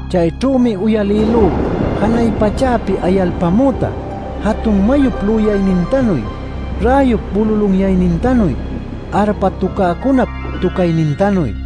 Chayćhümi uyalïlú janay pachäpi ayalpämüta, jatun mayup lüyaynintanuy, räyup bululunyaynintanuy, arpa tucäcunap tucaynintanuy.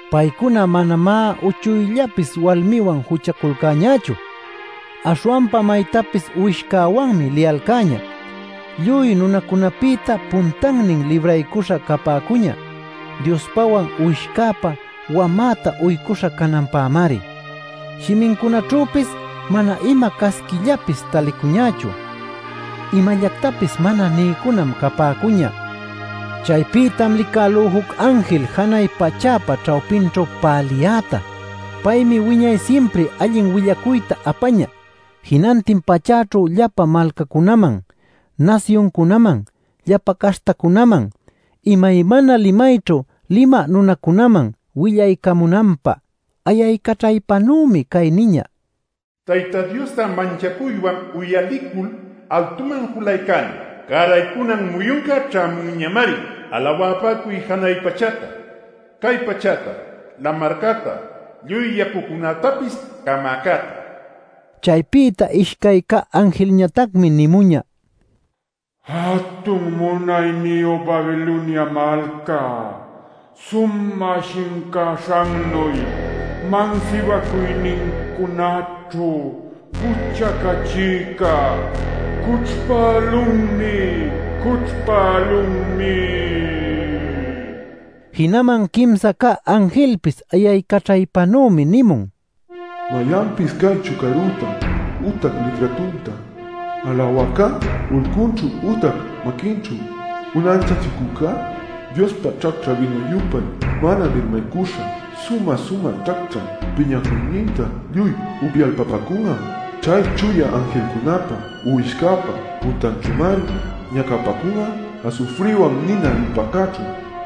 Paycuna manamá uchuyllapis walmiwan juchaculcäñächu. Aśhwanpa maytapis Uwishcäwanmi liyalcäñä. Lluy nunacunapïta puntannin libraycuśha capäcuñä Diospäwan Uwishcäpä wamäta uycuśha cananpämari. Shimincunaćhüpis manam ima casquillapis talicuñächu; imallactapis mana niycunam capäcuñä. Chaypïtam licälú juc anjil janay pachäpa ćhawpinćhu päliyäta. Paymi wiñay simpri allin willacuyta apañä jinantin pachäćhu llapa malcacunaman, nasyuncunaman, llapa caśhtacunaman, imaymana limayćhu limä nunacunaman willaycamunanpä. Ayaycaćhaypanümi cay niñä: “Tayta Diosta manchacuywan uyalicul altuman julaycäliy. Cäraycunan muyunca ćhämunñamari. Alawapäcuy janay pachäta, cay pachäta, lamarcäta, lluy yacucunätapis camäcäta” nil. Chaypïta ishcay cä anjilñatacmi nimuñä: “¡Jatun munayniyu Babilonia malca - sumä shincaśhannuy mansibacuynincunaćhu juchacachïca - cućhpälunmi, cućhpälunmi!” nil. Jinaman quimsa cä anjilpis ayaycaćhaypanümi nimun: “Mayanpis cay chucarüta ütac liträtunta alawäcá, ulcunćhu ütac maquinćhu unanchachicücá Diospa ćhacćhä bïnu-yupay mana mirmaycuśha sumä-sumä ćhacćhä piñacuynintam lluy upyalpapäcun'a. Chay chuya anjilcunäpa Uwishcäpa puntanćhümari ñacapäcun'a asufriwan nina lupäcäćhu.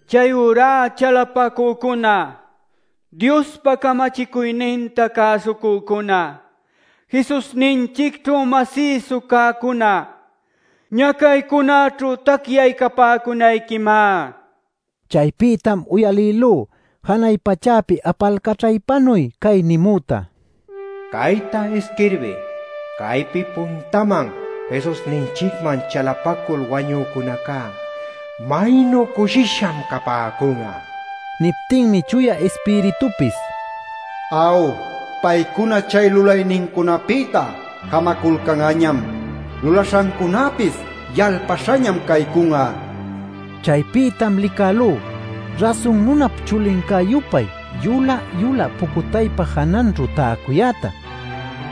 Chayurá chalapacücuna, Diospa camachicuyninta cäsucücuna, Jesusninchicćhu masïsu cäcuna ¡ñacaycunäćhu tacyaycapäcunayquimá! Chaypïtam uyalïlú janay pachäpi apalcaćhaypanuy cay nimüta: “Cayta isquirbiy: ‘Caypi puntaman Jesusninchicman chalapacul wañucücunacá ¡maynu cushisham capäcun'a!’” nil. Niptinmi Chuya Ispiritupis “Aw, paycuna chay lulaynincunapïta jamaculcan'añam; lulaśhancunäpis yalpaśhañam caycun'a” nin. Chaypïtam licälú Rasun Nunap chulincä-yupay yulä-yulä pucutaypa jananćhu täcuyäta.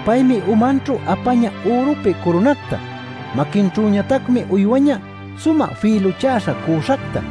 Paymi umanćhu apañä ürupi curunacta. Maquinćhüñatacmi uywañä sumä fïluchäśha cüśhacta.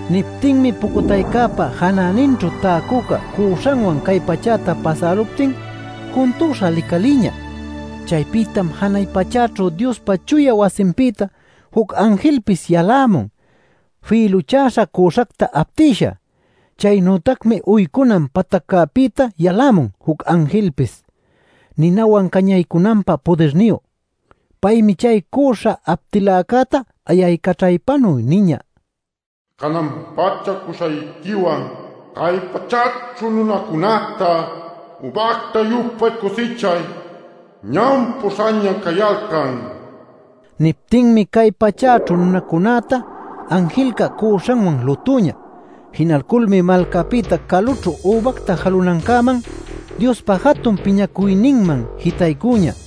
Niptinmi pucutaypa janäninćhu täcüca cüśhanwan cay pachäta pasäluptin juntüśha licalïñä. Chaypïtam janay pachäćhu Diospa chuya wasinpïta juc anjilpis yalämun fïluchäśha cüśhacta aptïsha. Chaynütacmi uycunan pataccäpïta yalämun juc anjilpis, ninawan cañaycunanpä pudirniyu. Paymi chay cüśha aptiläcäta ayaycaćhaypanuy niñä: “Canan-pacha cüśhayquiwan cay pachäćhu nunacunäta übacta-yupay cusichay; ñam pu'uśhaña cayalcan” nil. Niptinmi cay pachäćhu nunacunäta anjilca cüśhanwan lutüñä; jinalculmi malcapïta calućhu übacta jalunancäman, Diospa jatun piñacuyninman jitaycüñä.